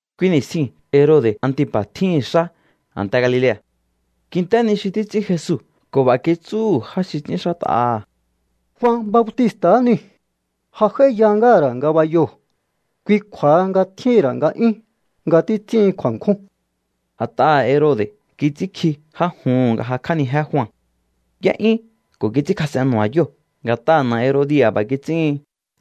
Kui ni̱stjiu̱n Herode̱ Antipa̱ tjíhi̱n xá a̱nte Galilea̱. Kint'é ni xi títs'ín Jesu ko̱ b'a̱ kitsúhu̱ já xi ts'ínxát'aha̱: —Jua Bautista̱ niu̱. Ja j'áíya ngáha̱ ra̱ ngabayoo̱. Kui kju̱a̱ha nga tjíhi̱n ra̱ nga'yún nga títs'íhin kju̱a̱nkjún. A̱t'aha̱ Herode̱ kits'ínkji já juhu̱n nga jakj'ánijé Jua. Y'é'yún ko̱ kits'ínkjas'en nu̱ba̱yóo̱. Nga̱t'aha̱ na̱ Herodia̱ b'a̱ kits'íhin.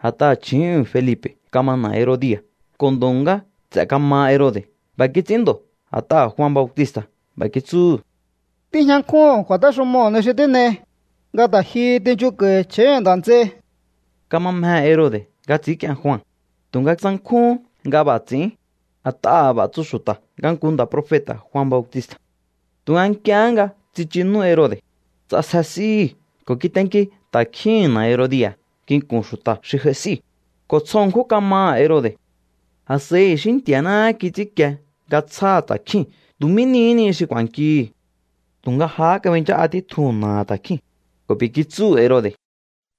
A̱t'aha̱ chju̱úhu̱n Felipe̱ kama na̱ Herodia̱, ko̱ ndo̱ ngá nts'e̱ kamaha Herode̱. B'a̱ kits'ín ndo̱ a̱t'aha̱ Jua Bautista̱ b'a̱ kitsúhu̱: —Tíjña nkjúhu̱n kju̱a̱téxumoo̱ ni xi tín'ei, nga ta̱ jihi tinchunko̱i̱ chju̱úhu̱n nda̱ nts'ei. Kama mjehe̱ Herode̱ nga ts'i̱ínk'ien Jua, tu̱nga tsankjúhún nga b'a̱ ts'i̱ín, a̱t'aha̱ b'a̱ tsu xu̱ta̱ nga nku nda̱ profeta̱ Jua Bautista̱. Tu̱nga nk'iehé nga tsichu nú Herode̱, ts'asje s'íhi̱ ko̱ kitenki ta̱kjíhi̱n na̱ Herodia̱ nginku̱n xu̱ta̱ xi j'ai s'íu̱, ko̱ tsjo ṉkjún kamaha̱ Herode̱. A̱s'a̱i i̱xí Nti̱a̱náhá kits'ínkie nga tsjáha̱ ta̱kjíu̱n tu̱ mí nihí ni xi ku̱a̱nkihi̱. Tu̱nga jahá kabinchá'a títjuhu̱n na̱aha̱ ta̱kjíu̱n, ko̱ b'i̱ kitsúhu̱ Herode̱: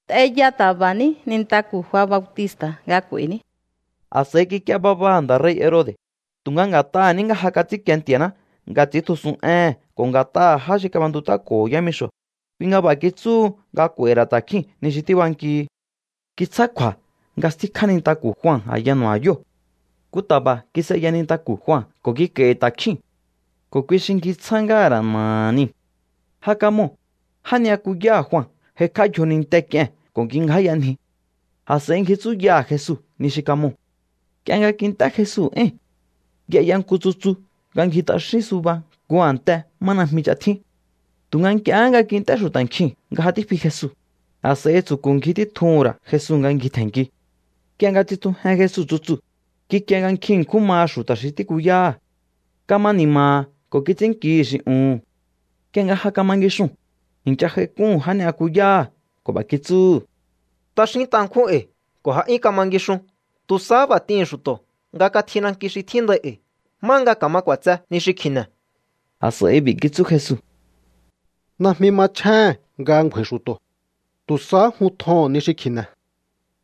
—T'eya ta̱ba̱ní nintaku̱ Jua Bautista̱ nga k'u̱a̱i̱ní. A̱s'a̱i kik'ie babaha̱ nda̱ rei̱ Herode̱, tu̱nga nga̱t'aha̱ ní nga ja kats'ínkie Nti̱a̱ná nga ts'i̱íntjusun éhe̱n ko̱ nga̱t'aha̱ já xi kab'entut'áko̱ho̱ yámixo̱, kui nga b'a̱ kitsúhu nga k'u̱a̱i̱hi̱ ra̱ ta̱kjíu̱n ni xi tíbankihi. Kitsjá kju̱a̱ nga stíkjá nintaku̱ Jua a̱ya nu̱ba̱yóo̱. Nku ta̱ba̱ kis'eya nintaku̱ Jua ko̱ kik'a̱i̱hi̱ ta̱kjíu̱n, ko̱ kui xi ngjitsjá ngáha̱ ra̱ na̱aha̱ niu̱. Ja kamoo̱, já ni'yakuyáha̱ Jua j'aikj'á yjoninte k'ie̱n ko̱ kingjáyanji. A̱s'a̱i ngji tsúyaha̱ Jesu ni xi kamoo̱. Nk'ie nga kint'é Jesu éi̱n, y'eya nku tsutsu nga ngji t'axín suba nku a̱nte má najmi ch'a tjín. Tu̱nga nk'iehé nga kint'é xu̱ta̱ nkjiu̱n nga ja tífi Jesu, a̱s'a̱i tsu̱ku̱ ngji títjuhu̱n ra̱ Jesu nga ngjitje̱nnki. Nk'ie nga tsitjujen Jesu tsutsuu̱, kikie nga nkjin ṉkjún maha xu̱ta̱ xi tíkuyáha̱. Kama ni̱ma̱ha̱ ko̱ kits'ínnkihi̱ xi uhu̱n. Nk'ie nga ja kama ngixuu̱n, i̱ncha j'aik'úhu̱n já ni'yakuyáha̱ ko̱ b'a̱ kitsúhu̱: —T'axínt'a ṉkjún e̱i̱ ko̱ ja 'yún kama ngixun. Tu̱ sahá b'a̱ t'ihi̱n xu̱to̱ nga katji nanki xi tjíndai e̱i̱ má nga ka̱ma k'u̱a̱tse ni xi kji̱ne̱. A̱s'a̱i b'i̱ kitsú Jesu: —Najmi machjéhe̱n nga ngju̱a̱i̱ xu̱to̱. Tu̱ sahá jun tjoho̱on ni xi kji̱ne̱.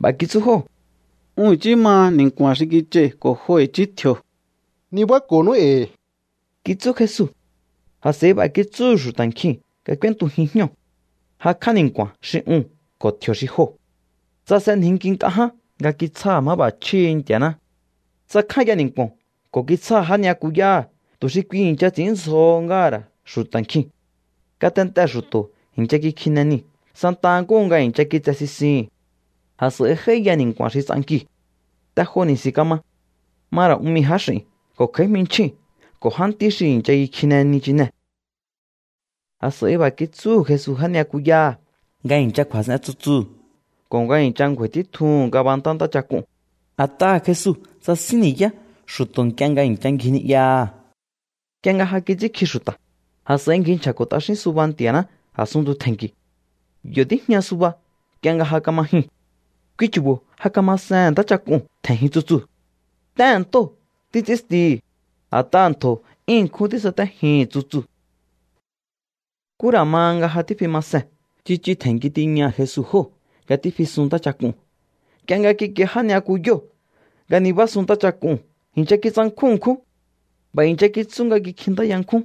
B'a̱ kitsú jóo̱: —Un i̱chí maha ni̱nku̱a̱n xi kich'ai̱ ko̱ jo i̱chí tji̱o̱. —Nibáko̱nú e̱i̱ —kitsú Jesu. A̱s'a̱i b'a̱ kitsúhu̱ xu̱ta̱ nkjiu̱n nga k'úéntujin jñóo̱. Jakj'á ni̱nku̱a̱n xi uu̱n ko̱ tji̱o̱ xi joo̱. Tsasenjinki nk'a ján nga kitsjáha̱ máb'a̱chjíhi̱ Nti̱a̱ná. Tsakjánya ni̱nku̱o̱n ko̱ kitsjáha̱ já ni'yakuyáha̱ tu̱ xi kui i̱ncha ts'i̱ínndzjo ngáha̱ ra̱ xu̱ta̱ nkjiu̱n. Ngatentee̱ xu̱to̱ i̱ncha kikjine niu̱ santa nkúhu nga i̱ncha kitse sisihi̱n. A̱s'a̱i j'áíya ni̱nku̱a̱n xi ts'ankiu̱. Te jo ni̱si̱n kama. Ma ra̱ un mii̱ jáx'i̱n ko̱ kj'a̱í jminchjíu̱n ko̱ jántí xi i̱ncha kikjine nichinee̱. A̱s'a̱i b'a̱ kitsúhu̱ Jesu já ni'yakuyáha̱ nga i̱ncha kju̱a̱s'en tsutsuu̱ ko̱ nga i̱ncha ngju̱a̱i̱ títjuhu̱n ngabantá ntáchak'uu̱n, a̱t'aha̱ Jesu tsasín ni̱yá xu̱to̱ nk'ie nga i̱ncha ngji ni'yaha̱. Nk'ie nga ja kits'ínkji xu̱ta̱, a̱s'a̱i ngji nchja̱ko̱ t'axín suba Nti̱a̱ná a̱sunntu tje̱nki̱u̱. Yo̱ tíjña suba nk'ie nga ja kama jyun. Kui chu̱bo̱ ja kamasehe̱n ntáchak'uu̱n tje̱njin tsutsuu̱. T'éhe̱n ntóo̱ títs'ínstihi̱, a̱t'aha̱ ntjo̱ 'yún ṉkjún tísatéjihi̱n tsutsuu̱. Nkú ra̱ ma nga ja tífi ma sen, tsichu tje̱nnki tiña Jesu jóo̱ nga tífisun ntáchak'uu̱n. Nk'ie nga kikie já ni'yakuyóo̱ nga nibásun ntáchak'uu̱n, i̱ncha kitsankjún ṉkjún. B'a̱ i̱ncha kitsú nga kikjintáya nkjún: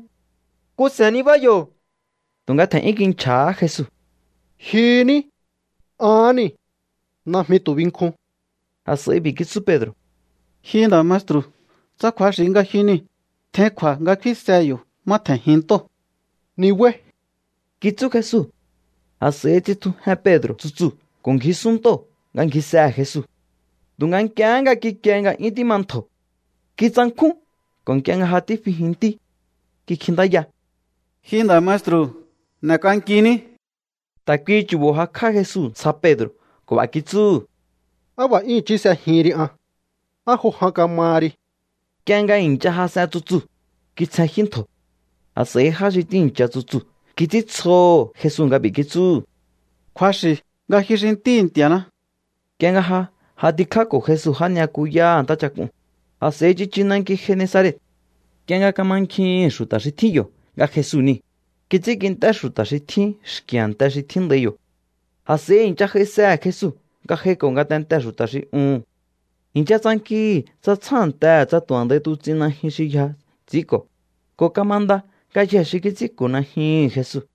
—¡Nku se̱n nibá yo̱! Tu̱nga tje̱n'yún kinchja̱há Jesu: —¡Jyu ní! ¡Ahán niu̱! ¡Najmi tu̱ binkjun! A̱s'a̱i b'i̱ kitsú Pedro̱: —Ji nda̱ maestru̱, tsa kju̱axi̱ nga ji niu̱, tjein kju̱a̱ nga kfínsehe yo̱ má tje̱njin ntóo̱. —Nibáí —kitsú Jesu. A̱s'a̱i tsitjujen Pedro̱ tsutsuu̱ ko̱ ngjisun ntóo̱ nga ngjisehe̱ Jesu. Tu̱nga nk'iehé nga kikie nga 'yún tíma ntjo̱, kitsankjún ko̱ nk'ie nga ja tífijintí, kikjintáya: —¡Ji nda̱ maestru̱, n'e̱k'ankiní! Ta̱ kuihi chu̱bo̱ jakj'á Jesu ntsja Pedro̱ ko̱ b'a̱ kitsúhu̱: —¡Á b'a̱ 'yún i̱chí s'ejihin ri an! ¿Á jo jan kamaha ri? Nk'ie nga i̱ncha jas'en tsutsuu̱, kitsjenjyú ntjo̱. A̱s'a̱i já xi tíi̱ncha tsutsuu̱ kits'íntsjoho̱ Jesu nga b'i̱ kitsúhu̱: —Kju̱axi̱ nga ji xi Ntíhi̱ Nti̱a̱ná. Nk'ie nga ja j'atikjáko̱ Jesu já ni'yakuyáha̱ ntáchak'uu̱n, a̱s'a̱i tsichu nanki Genesaret. Nk'ie nga kamankjihi̱n xu̱ta̱ xi tjín yo̱ nga Jesu niu̱, kits'ínkint'é xu̱ta̱ xi tjín xki̱ a̱nte xi tjíndai yo̱. A̱s'a̱i i̱ncha j'aisehe̱ Jesu nga j'aiko̱ ngatentee̱ xu̱ta̱ xi uhu̱n. I̱ncha tsankihi̱ tsa tsjántehe̱ tsa tu̱ a̱ndai tuts'in najyun xi yja ts'i̱ínko̱, ko̱ kamanda ngayjee̱ xi kits'ínko̱ najyuhu̱n Jesu.